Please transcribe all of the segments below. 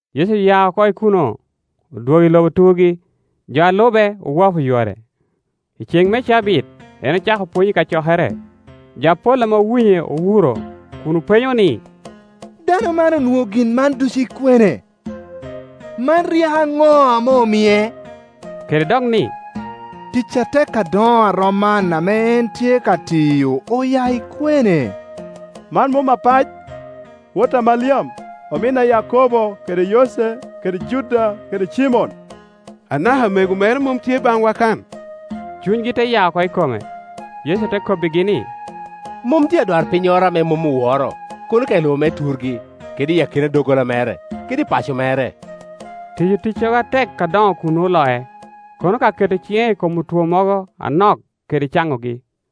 Yecu oya oko i kuno, odwogo i lobo turgi; jo a lube owapo yore. I ceŋ me cabit en ocako pwony i kacokere. Jo apol ame owinye owuro, kun openyo ni, “Dano man onwoŋo gin man ducu i kwene? Man ryeko aŋo ame omie?” Kede dok ni, “Tic atek adoŋo a rom man ame en tye ka tiyo oya i kwene? Man mom apac, wot a Maliam, omin a Yakobo kede Yoce kede Juda kede Cimon? Anaka amego mere mom tye baŋwa kan?” Cunygi te ya oko i kome. Yecu te kobbigi ni, “Mom tye adwarpinnyoro ame mom oworo, kono ka i lobo me turgi, kede i akina doggola mere, kede i paco mere.” Tiyo ticcogo atek adoŋo kuno oloc, kono ka keto ciŋe i kom otwo mogo anok kede caŋogi.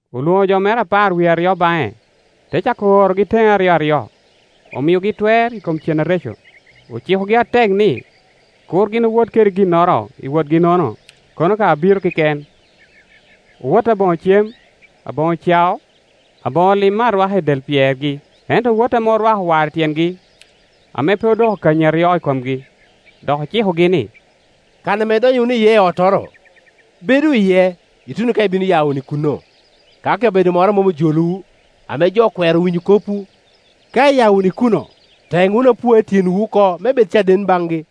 Olwoŋo jo mere apar wie aryo baŋe, te cako orogi teŋe aryoaryo, omiogi twer i kom cen areco. Ocikogi atek ni kur gin owot kede ginnoro i wotgi-nono kono ka abiro keken. Owot aboŋo cem, aboŋo cao, aboŋo lim me arwaka i del pyergi; ento owot ame orwako war i tyengi, ame pe odoko kanyi aryo i komgi. Dok ocikogi ni, “Kan ame idonyo wunu iye i ottoro, bedu iye ituno ka ibino ya wunu i kuno. Ka kabedo moro mom ojolowu, ame jo okwero winyo kopwu, ka iya wunu i kuno, teŋ wunu apua i tyenwu oko me bed caden baŋgi.”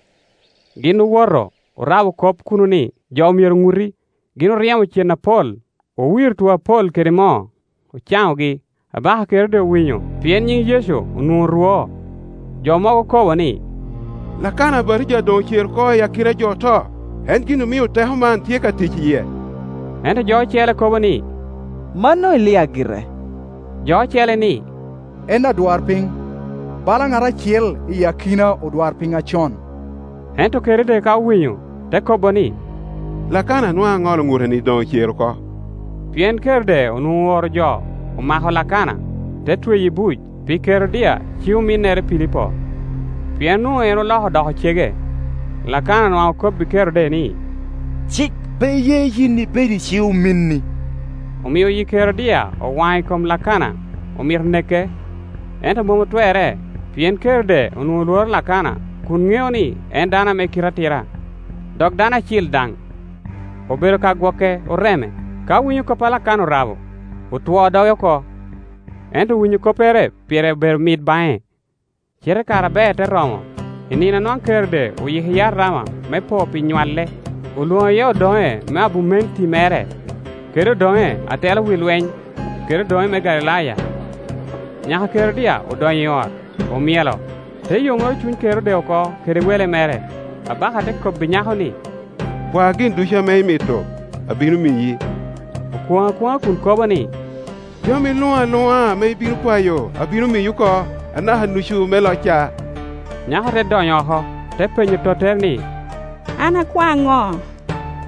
Gin owoto, orabo kop ni, jo myero oŋuti. Gin oryemo cen apol, owiro otwo apol kede moo, ocaŋogi. Abaka Kerode owinyo, pien nyiŋ Yecu onwoŋo orwo. Jo mogo kobo ni, “Lakana Abatija doŋ ocero oko i akina jo oto; en gin omio teko man tye ka tic i yie.” Ento jo ocele kobo ni, “Mano Elia gire.” Jo ocele ni, “En adwarpiny, bala ŋat acel i akina odwarpiny acon.” Ento Kerode ka owinyo, te kobo ni, “Lakana a nwaŋ aŋolo ŋuteni doŋ ocere oko.” Pien Kerode onwoŋo ooro jo, omako Lakana, te tweye i buc pi Kerodia, ci-ominnere Pilipo; pien onwoŋo en oloko odoko cege. Lakana nwaŋ okobbi Kerode ni, “Cik pe ye in ibed i ci-ominni.” Omio yi Kerodia owaŋ i kom Lakana, omito neke, ento mom otwerre, pien Kerode onwoŋo lworo Lakana kun ŋeo ni en dano ame kite atira, dok dano acil daŋ, obedo ka gwoke oreme. Ka winyo kop a Lakana orabo, otwoo doge oko, ento winyo koppere pire obedo mit baŋe. Cite kare aber te romo i nino a nwaŋ Kerode oyiko iye arama me po pi nywalle, olwoŋo iye odoŋe me abumenti mere, kede odoŋe a telo wi lweny, kede odoŋe me Galilaya. Nyaka a Kerodia odonyo i ot, omyelo, te yomoro cuny Kerode oko kede wele mere. Abaka te kobbi nyako ni, “Kwa gin ducu ame imito, abino miyi.” Okwoŋo akwoŋa kun kobo ni, “Jami luŋ aluŋa ame ibino kwayo, abino miyi oko, anaka nucu me locca.” Nyako te donyo oko, te penyo tottere ni, “An akwa ŋo?”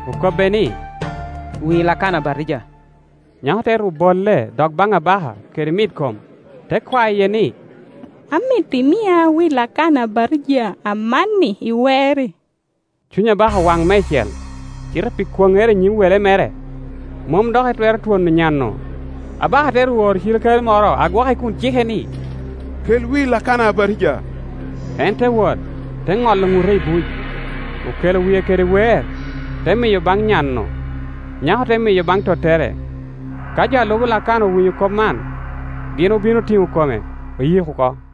Okobbe ni, “Wi Lakana Abatija.” Nyako te ru bolle dok baŋ abaka kede mitkome, te kwaye ni, “Amito imia wi Lakana Abatija amanni, i weer-ri.” Cuny abaka owaŋ meicel, cite pi kwoŋŋere i nyim wele mere, mom dok etwero twono nyan-nu. Abaka te ru oro cirikale moro a gwoke kun cike ni, “Kel wi Lakana Abatija.” En te wot, te ŋolo ŋute i buc. Okelo wie kede weer, te miyo baŋ nyan-nu, nyako te miyo baŋ tottere. Ka jo a lubo Lakana owinyo kop man, gin obino otiŋo kome, oyiko oko.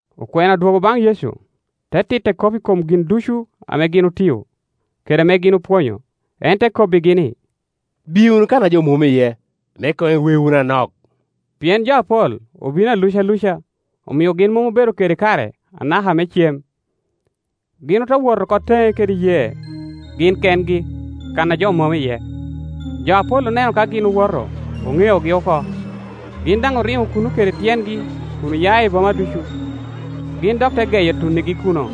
Okwena odwogo baŋ Yecu, te titte kop i kom gin ducu ame gin otio, kede ame gin opwonyo. En te kobbigi ni, “Biye wunu kan a jo mom iye, me koŋ iwe wunu anok”, pien jo apol obino aluca luca, omio gin mom obedo kede kare anaka me cem. Gin ote wot oko teŋe kede yee, gin kengi, kan a jo mom iye. Jo apol oneno ka gin woto, oŋeogi oko. Gin daŋ oriŋo kuno kede tyengi kun oya i boma ducu, gin dok te geyo tuŋŋigi kuno.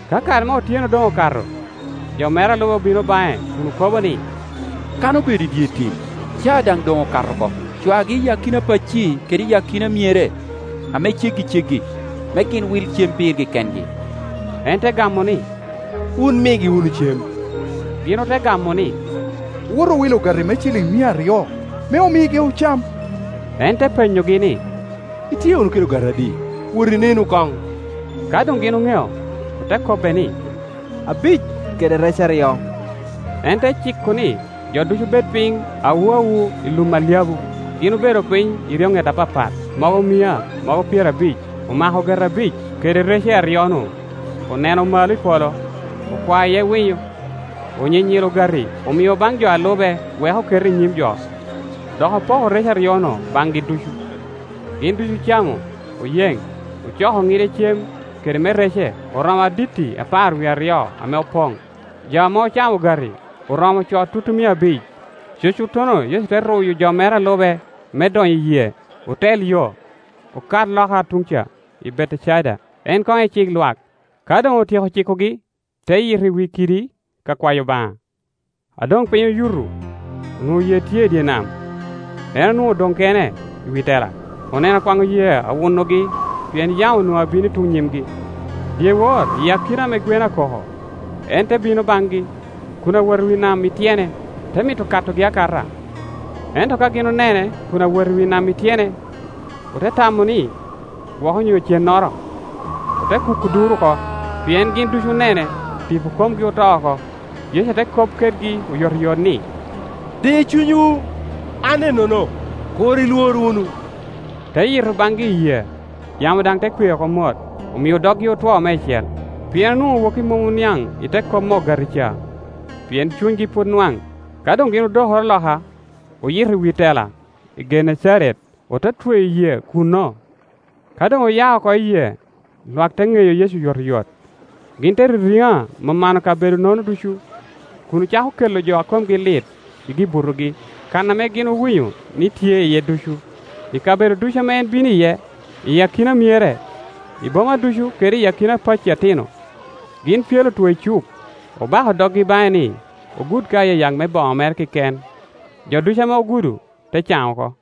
Ka kare me otyeno doŋ okato, jo mere a lube obino baŋe kun okobo ni, “Kan obedo i dye tim, caa daŋ doŋ okato oko. Cwagi i akina pacci kede i akina myere ame ceggiceggi, me gin wil cem pirgi kengi.” En te gamo ni, “Wun migi wunu cem.” Gin ote gamo ni “Owot owil ogati me ciliŋ mia aryo, me omigi ocam?” En te penyogi ni, “Itye wunu kede ogati adi? Wot inenu koŋ.” Ka doŋ gin oŋeo, ote kobbe ni, “Abic, kede rec aryo.” En te ciko ni jo ducu bed piny awu awu i Ium alyabu. Gin obedo piny i eryoŋet apapat, mogo mia, mogo pyerabic. Omako ogati abic kede rece aryo-nu, oneno malo i polo, okwao iye winyo, onyinyilo ogati, omio baŋ jo a lube wek oket i nyim jo; dok opoko rece aryo-nu baŋgi ducu. Gin ducu ocamo, oyeŋ. Ocoko ŋide cem kede me rece, oromo aditti apar wie aryo ame opoŋ. Jo ame ocamo ogati oromo co tutumia abic. Cucuttono Yecu te ruyo jo mere a lube me donyo i yee, otel yo, okat loka tuŋ ca i Betecaida, en koŋ ecik lwak. Ka doŋ otyeko cikogi, te yito i wi kidi ka kwayo Obaŋa. A doŋ piny oyuto, onwoŋo yee tye i dye nam, en onwoŋo odoŋ kene i wi tela. Oneno kwaŋo yee awunogi, pien yamo onwoŋo abino i tuŋ nyimgi. Dyewor i akina ame gwen akoko en te bino baŋgi kun awot i wi nam i tyene, te mito katogi akata. Ento ka gin onene kun awot i wi nam i tyene, ote tamo ni gwok onyo cennoro, ote kuko duro oko; pien gin ducu onene, tipo komgi oto oko. Yecu te kop kedgi oyotoyot ni, “Di cunywu, an ennono, kur ilwor wunu.” Te yito baŋgi i yee, yamo daŋ te kwe oko mot; omio doggi otwo meicel, pien onwoŋo woki mom oniaŋ i te kop me ogati ca, pien cunygi pwod nwaŋ. Ka doŋ gin odokoro loka, oyito i wi tela i Genecaret, ote tweyo yee kuno. Ka doŋ oya oko i yee, lwak te ŋeyo Yecu oyotoyot. Gin te ririŋa mano kabedo-nono ducu, kun ocako kela jo a komgi lit i gi-butogi kan ame gin owinyo ni tye iye ducu. I kabedo ducu ame en bino iye, i akina myere, i boma ducu kede i akina pacci atino, gin pyelo otwo i cuk, obako doggi baŋe ni ogud ka ayayak me boŋo mere keken; jo ducu ame ogudo te caŋ oko.